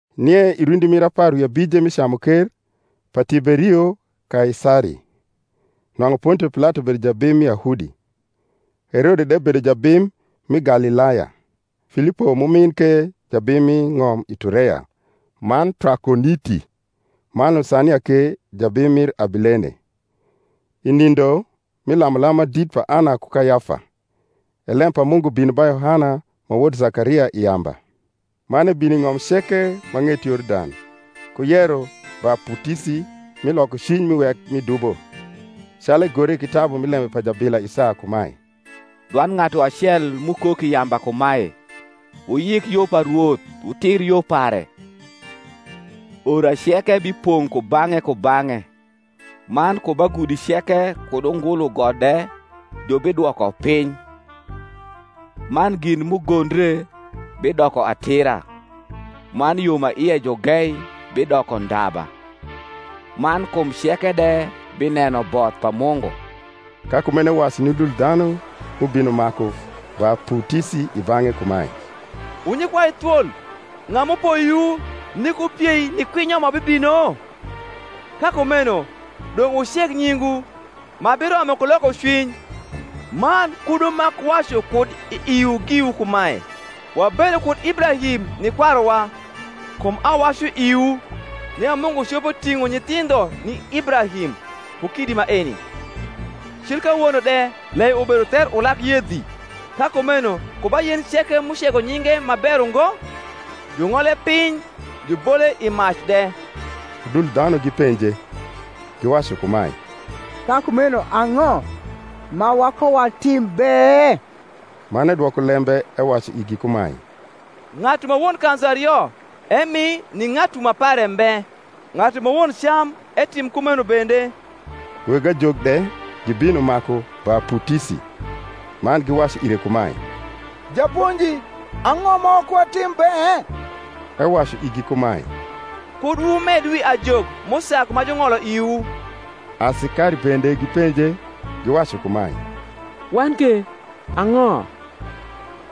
Nie i rundi mir apar wi abije mi camuker pa Tiberio Kaisari, nwang’u Pontio Pilato bedo jabim mi Yahudi, Herode de bedo jabim mi Galilaya, Filipo m’umin ke jabim mi ng’om Itureya man Trakoniti, man Lusania ke jabim mir Abilene, i nindo mi lamulam ma dit pa Ana ku Kayafa, e lem pa Mungu bino ba Yohana ma wod Zakaria i yamba. Man ebino i ng’om ceke ma ng’et Yordan, ku yero baputisi mi lokocwiny ni wek mi dubo; calu egore i kitabu mi lembe pa jabila Isaya kumae, Dwand ng’atu acel m’ukok i yamba kumae, Wuyik yo pa Rwoth Wutir yo pare. Ora ceke bipong’ kubang’e kubang’e, Man ku ba gudi ceke kud ungulu got de jubidwoko piny; Man gin m’ugondre bidoko atira, Man yo ma ie ju gei bidoko ndaba; Man kum ceke de bineno both pa Mungu. Ka kumeno ewacu ni udul dhanu m’ubino maku baputisi i bang’e kumae, Wu nyikwai thwol, ng’a m’upoyowu nik wupiei ni kwinyo ma bibino? Ka kumeno dong’ wuceg nyingwu ma biromo ku lokocwiny, man kud wumak wacu kud i iwu giwu kumae, Wabedo kud Ibrahim ni kwaruwa; kum awacu iwu, nia Mungu copo ting’o nyithindho ni Ibrahim ku kidi maeni. Cil kawono de lei ubedo ther ulag yedhi: ka kumeno ku ba yen ceke m’ucego nyinge ma ber ungo jung’ole piny, jubole i mac de. Udul dhanu gipenje, giwacu kumae, Ka kumeno ang’o ma wakowatim be? Man edwoko lembe ewacu igi kumae, Ng’atu ma won kanzu ario, emi ni ng’atu ma pare mbe; ng’atu ma won cam, etim kumeno bende. Weg ajok de gibino maku baputisi, man giwacu ire kumae, Japonji, ang’o ma wakowatim be? Ewacu igi kumae, Kud wumed wi ajok m’usag ma jung’olo iwu. Asikari bende gipenje, giwacu kumae, Wan ke, ang’o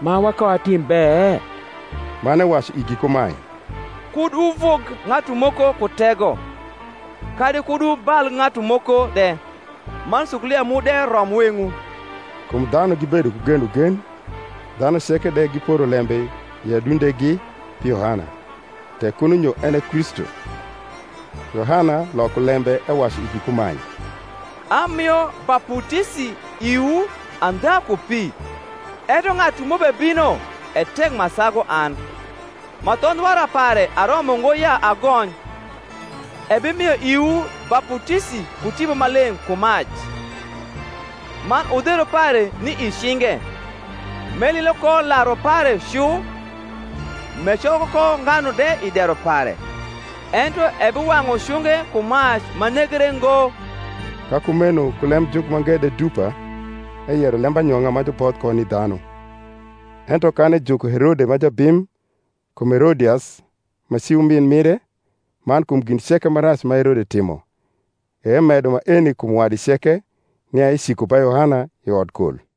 ma wakowatim be? Man ewacu igi kumae, Kud wuvug ng’atu moko ku tego, kadi kud wubal ng’atu moko de; man sukulia mu de rom weng’wu. Kum dhanu gibedo ku genogen, dhanu ceke de giporo lembe i adundegi pi Yohana, tek kuno nyo en e Kristu; Yohana loko lembe ewacu igi kumae, Amio baputisi iwu andha ku pi; ento ng’atu m’ubebino e tek ma sagu an, ma thondh wara pare aromo ngo ya agony: ebimio iwu baputisi ku Tipo Maleng’ ku mac: man udheru pare ni i cinge, m’elilo ko laru pare cu, m’ecoko ko nganu de i dero pare; ento ebiwang’u cunge ku mac ma negre ngo. Ka kumeno ku lemjuk mange de dupa eyero lembanyong’a ma juboth ko ni dhanu; ento kan ejuko Herode ma jabim, kum Herodias ma ci umin mire man kum gin ceke ma rac ma Herode timo, e emedo maeni kum wadi ceke, nia eciko ba Yohana i odkol.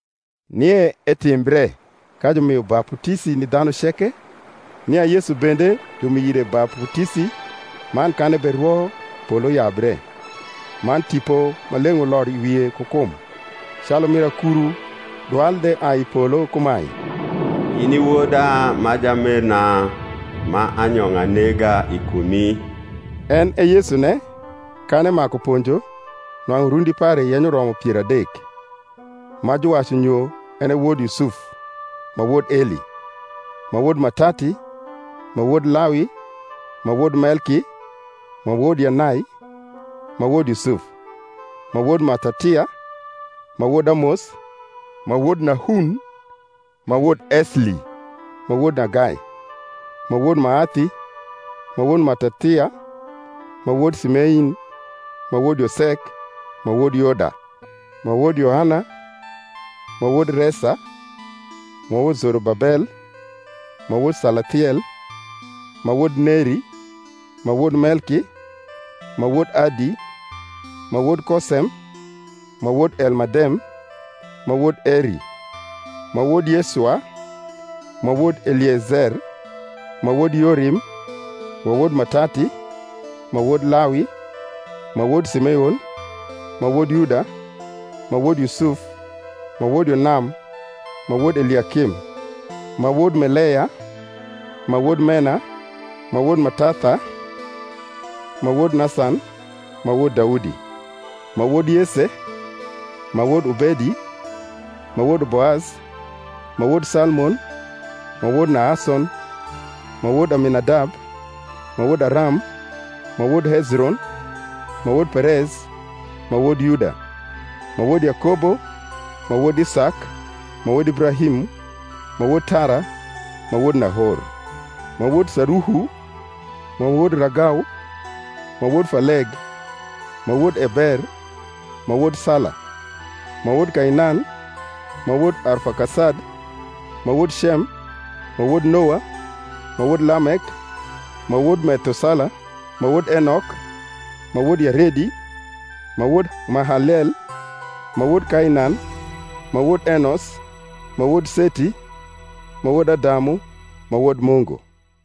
Nie etimbre, ka jumio baputisi ni dhanu ceke, nia Yesu bende jumio ire baputisi, man kan eberwo, polo yabre, man Tipo Maleng’ uloro i wie ku kum, calu mir akuru, dwal de ai i polo kumae, In i Woda ma jamerna; ma anyong’a nega i kumi. En e Yesune, kan emaku ponjo, nwang’u rundi pare yenyo romo pier adek, (ma juwacu nyo) en e wod Yusuf, ma wod Eli, ma wod Matati, ma wod Lawi, ma wod Melki, ma wod Yanai, ma wod Yusuf, ma wod Matathia, ma wod Amos, ma wod Nahun, ma wod Esli, ma wod Nagai, ma wod Maathi, ma wod Matathia, ma wod Simein, ma wod Yosek, ma wod Yoda, ma wod Yohana, ma wod Resa, ma wod Zorobabel, ma wod Salathiel, ma wod Neri, ma wod Melki, ma wod Adi, ma wod Kosem, ma wod Elmadem, ma wod Eri, ma wod Yesua, ma wod Eliezer, ma wod Yorim, ma wod Matati, ma wod Lawi, ma wod Simeon, ma wod Yuda, ma wod Yusuf, ma wod Yonam, ma wod Eliakim, ma wod Meleya, ma wod Mena, ma wod Matatha, ma wod Nasan, ma wod Daudi, ma wod Yese, ma wod Obedi, ma wod Boaz, ma wod Salmon, ma wod Nahason, ma wod Aminadab, ma wod Aram, ma wod Hezron, ma wod Perez, ma wod Yuda, ma wod Yakobo, ma wod Isak, ma wod Ibrahim, ma wod Tara, ma wod Nahor, ma wod Saruhu, ma wod Ragau, ma wod Faleg, ma wod Eber, ma wod Sala, ma wod Kainan, ma wod Arfakasad, ma wod Cem, ma wod Noa, ma wod Lamek, ma wod Methusala, ma wod Enok, ma wod Yaredi, ma wod Mahaleel, ma wod Kainan, ma wod Enos, ma wod Seti, ma wod Adamu, ma wod Mungu.